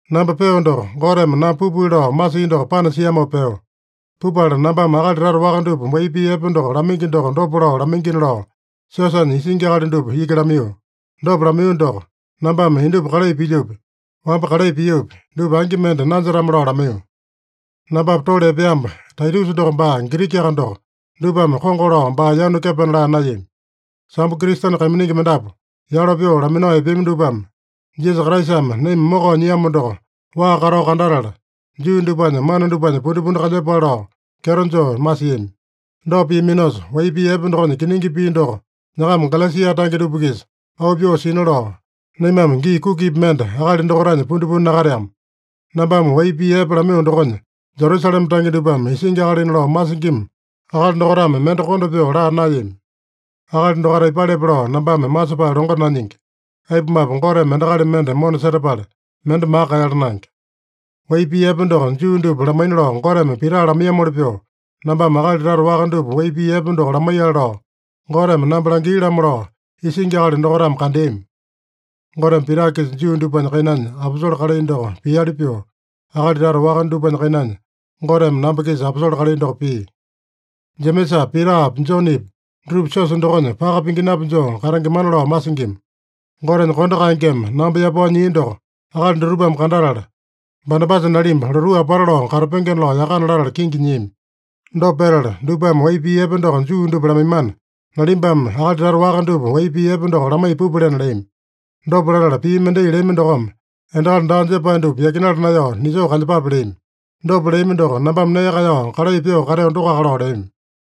Namba peo doko, Goteme namba pupili lao masia doko panasiamopa peo. Pupala nambame akali tata waka dupa wai pii epe doko lamaingi doko dopa lao lamaingina lao, siosanya isingi akali dupa iki lamaiyo. Dopa lamaiyo doko, nambame indupa kalai pilyopi, wamba kalai piopi, dupa angi mende nanjetame-lao lamaiyo. Nambapa tole epeamba Taitusa doko baa Girikiaka doko, dupame kongo lao baa yanu kepena laa naeyami. Sambo Kristene kaiminingi mendapu yalo pyoo laminao epeami dupame, Jisasa Kraisame naima mokao nyiamo doko waa katao kandatala, Juu dupanya mana dupanya pundipundi kalyepale lao kyeto joo masiami. Dopa piaminosa, wai pii epe dokonya kiningi pii doko nyakama Galesia tange dupa-kisa auu pyoo sina lao, naimame gii kukipi mende akali dokaitanya pundipundi nakateama. Nambame wai pii epe lamaiyo dokonya Jerusalema tange dupame isingi akalina lao masingima akali dokaitame mende konda pyoo laa naeyami. (Akali dokaita aipalepe lao nambame masepae longo nanyingi. Aipumape, Goteme endakali mende mona setapala, mende maka kaeyala naenge.) Wai pii epe doko Juu dupa lamaina lao Goteme Pita lamaiyamoli pyoo, nambame akali tata waka dupa wai pii epe doko lamaiyale lao Goteme namba langia-lamo lao, isingi akali dokaitame kandeami. (Goteme Pita-kisa Juu dupanya kainanya aposole kalai doko piali pyoo, akali tata waka dupanya kainanya Goteme namba-kisa aposole kalai doko pia.) Jemesapi, Pitapi, Jonepi dutupa siosa dokonya paka pinginapi joo katengemana lao masingima. Gotenya kondo kaengeme namba yapao nyia doko akali dutupame kandatala, Banabasa nalimba lotuu apata lao katapengena lao yakana latala kingi nyiami. Dopa petala, dupame wai pii epe doko Juu dupa lamaimana, nalimbame akali tata waka dupa wai pii epe doko lamaiya pupalena leami. Dopa latala, pii mendai leami dokome, endakali daa jepae dupa yakinala naeyao nisoo kalyepape leami. Dopa leami doko, nambame nee kaeyao kalai pyoo kateo dokoaka lao leami.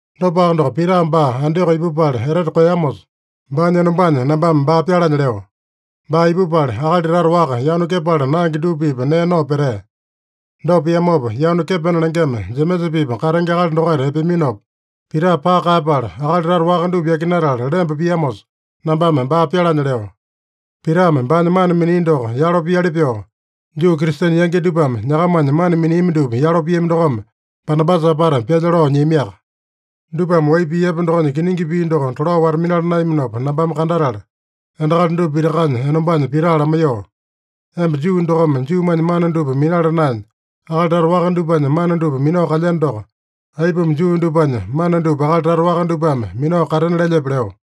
Dopaka doko, Pita baa Antioko ipupala etete koeyamosa, baanya enombanya nambame baa pyalanya leo. Baa ipupala, akali tata waka yanu kepala naenge dupa-pipa nee nao petea. Dopa piamopa, yanu kepena lengema Jemesa-pipa katenge akali dokaita epeaminopa, Pita paka kaeyapala, akali tata waka dupa yakinatala lemba piamosa, nambame baa pyalanya leo. Pitame baanya mana minia doko yalo piali pyoo, Juu Kristene yangi dupame nyakamanya mana miniami dupa yalo piami dokome, Banabasa apata pyalya lao nyiamiaka. Dupame wai pii epe dokonya kiningi pii doko tolao wata-minala naeyaminopa nambame kandatala, endakali dupa pitakanya enombanya Pita lamaiyoo, “Emba Juu dokome Juumanya mana dupa minala naenya, akali tata waka dupanya mana dupa minao kalyeno doko, aipuma Juu dupanya mana dupa akali tata waka dupame minao katena lelyepe?” leo.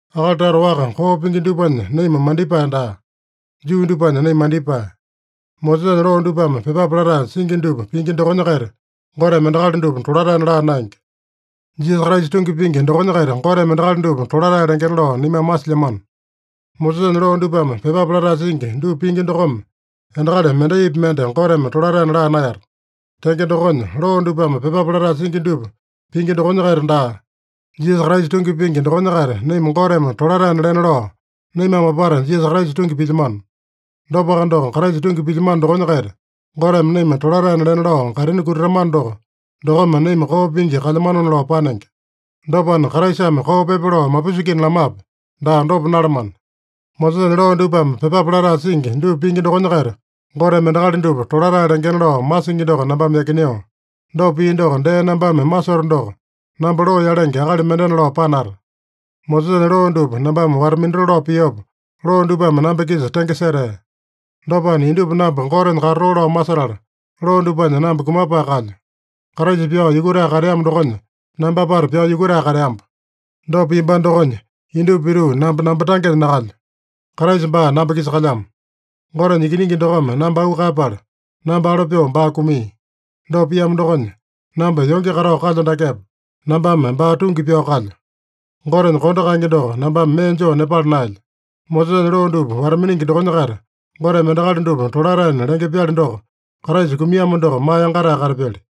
Akali tata waka koo pingi dupanya naima mandipae daa. Juu dupanya naima mandipae. Mosesanya loo dupame pyepape latae singi dupa pingi dokonya-kaita Goteme endakali dupa tolataena laa naenge. Jisasa Kraisa tungi pingi dokonya-kaita Goteme endakali dupa tolatae lengena lao naimame masilyamano. Mosesanya loo dupame pyepape latae singi dupa pingi dokome endakali mendaipi mende Goteme tolataena laa naeyata. Tenge dokonya, loo dupame pyepape latae singi dupa pingi dokonya-kaita daa, Jisasa Kraisa tungi pingi dokonya-kaita naima Goteme tolataena lena lao, naimame apata Jisasa Kraisa tungi pilyamano. Dopaka doko, Kraisa tungi pilyamano dokonya-kaita Goteme naima tolataena lena lao kaitini kutatamano doko, dokome naima koo pingi kalyamanona lao panenge. Dopana, Kraisame koo pyepa lao mapusingina lamape? Daa, dopa nalamana! Mosesanya loo dupame pyepape latae singi dupa pingi dokonya-kaita Goteme endakali dupa tolatae lengena lao masingi doko nambame yakineo. Dopa pio doko dee nambame masoto doko, namba loo yalenge akali mendena lao panata. Mosesanya loo dupa nambame wata-minatoo lao piopa, loo dupame namba-kisa tenge setea. Dopana, indupa namba Gotenya katatoo lao masetala, loo dupanya namba kumapae kalyo. Kraisa pyao yukutae kateamo dokonya, namba apata pyao yukutae kateamba. Dopa piambano dokonya, indupa pituu namba, namba tangenya nakalyo. Kraisa baa namba-kisa kalyamo. Gotenya Ikiningi dokome namba auu kaeyapala, namba alo pyoo baa kumia. Dopa piamo dokonya, namba yonge katao kalyo dakepa, nambame baa tungi pyao kalyo. Gotenya kondo kaenge doko nambame mee joo nepala naelyo. Mosesanya loo dupa wata-miningi dokonya-kaita Goteme endakali dupa tolataena lenge-pyali doko, Kraisa kumiamo doko maa yangatae katapyali.